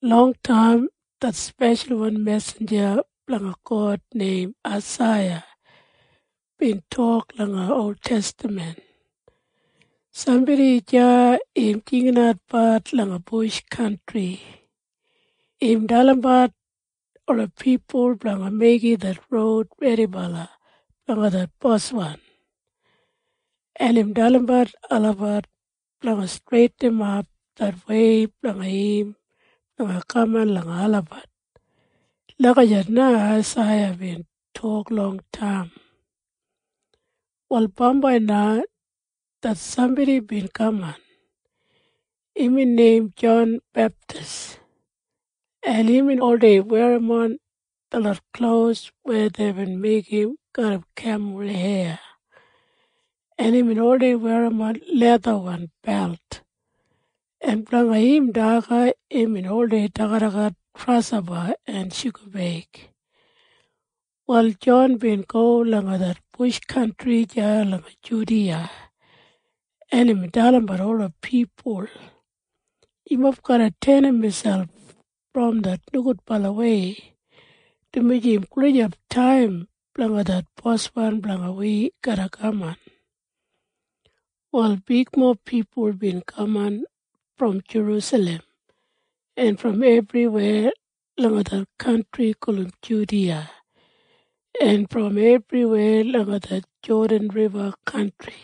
Longtaim det speshalwan mesinja blanga God neim Aisaiya bin tok langa oltestaman, “Sambodi deya im jinginatbat langa bush kantri. Im dalimbat ola pipul blanga meigim det roud redibala blanga det Boswan, en im dalimbat olabat blanga streitinimat det wei blanga im blanga kaman langa olabat.” Lagijat na Aisaiya bin tok longtaim. Wal bambai na det sambodi bin kaman. Imbin neim Jon Beptis, en imbin oldei werrim detlot klos weya deibin meigim garram kemul heya, en imbin oldei werrim lethawan belt, en blanga im daga imbin oldei dagadagat grashopa en shugabeig. Wal Jon bin go langa det bush kantri deya langa Judiya, en imbin dalimbat ola pipul, “Yumob garra tenim miselp brom det nogudbalawei, dumaji im gulijap taim blanga det bos blanga wi garra kaman.” Wal bigmob pipul bin kaman brom Jerusalem en brom ebriweya langa det kantri gulum Judiya en brom ebriweya langa det Jodan Riba kantri.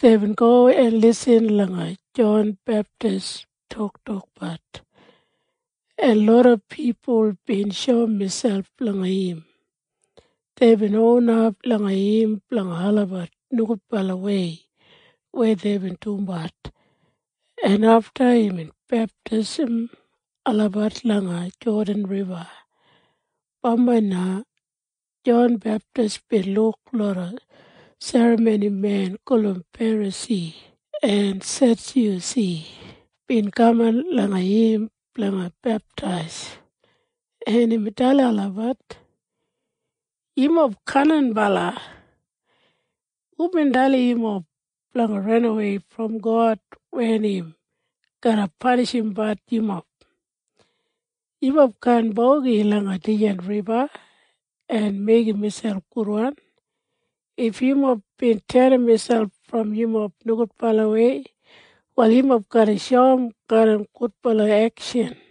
Deibin go en lisin langa Jon Beptis toktokbat, en loda pipul bin shoum miselp langa im. Deibin onap langa im blanga olabat nogudbalawei weya deibin dumbat, en afta imbin beptaisim olabat langa det Jodan Riba. Bambai na Jon Beptis bin luk loda serramonimen gulum Ferasi en Sedyusi bin kaman langa im blanga beptais, en imbin dalim olabat, “Yumob kaninbala! Hubin dalim yumob blanga ranawei brom God wen im garra panishimbat yumob? Yumob kaan bogi langa dijan riba en meigim miselp gudwan. If yumob bin tenim miselp brom yumob nogudbalawei, wal yumob garra shoum garram gudbala ekshan.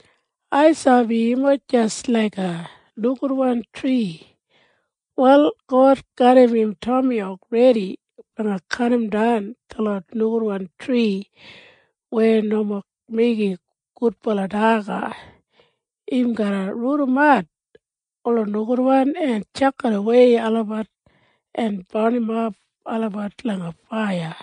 Ai sabi yumob jis laiga nogudwan tri. Wal God garram im tomiyauk redi blanga kadimdan detlot nogudwan tri weya nomo meigim gudbala daga. Im garra rudimat ola nogudwan en tjakidawei olabat en barnimap olabat langa faiya.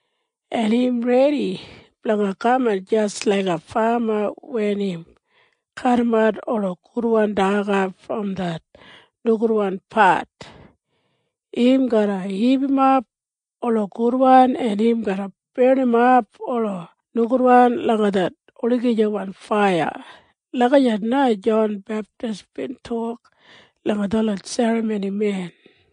En im redi blanga kaman jis laiga fama wen im kadimat ola gudwan daga brom det nogudwan pat. Im garra hipimap ola gudwan, en im garra barnimap ola nogudwan langa det olagijawan faiya.” Lagijat na Jon Beptis bin tok langa detlot serramonimen.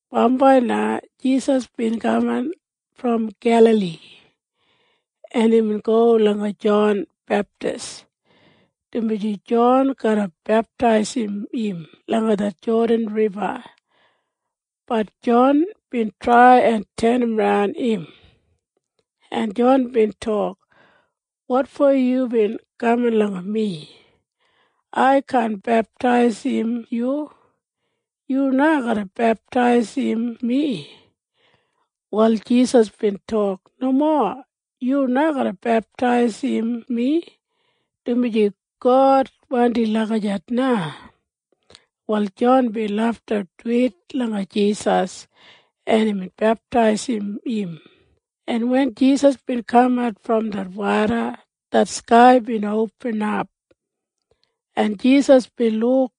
Bambai na Jisas bin kaman brom Gelali, en imbin go langa Jon Beptis, dumaji Jon garra beptaisim im langa det Jodan Riba. Bat Jon bin trai en tenimran im, en Jon bin tok, “Wotfo yubin kaman langa mi? Ai kaan beptaisim yu. Yu na garra beptaisim mi.” Wal Jisas bin tok, “Nomo. Yu na garra beptaisim mi, dumaji God wandim lagijat na.” Wal Jon bin lafta duwit langa Jisas, en imbin beptaisim im, en wen Jisas bin kamat brom det woda, det skai bin opinap, en Jisas bin luk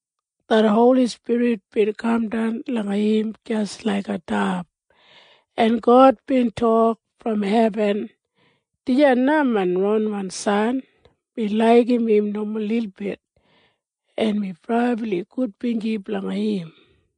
det Holi Spirit bin kamdan langa im jis laiga dab, en God bin tok brom hebin, “Dijan na main ronwan san. Mi laigim im nomo lilbit, en mi brabli gudbinji blanga im.”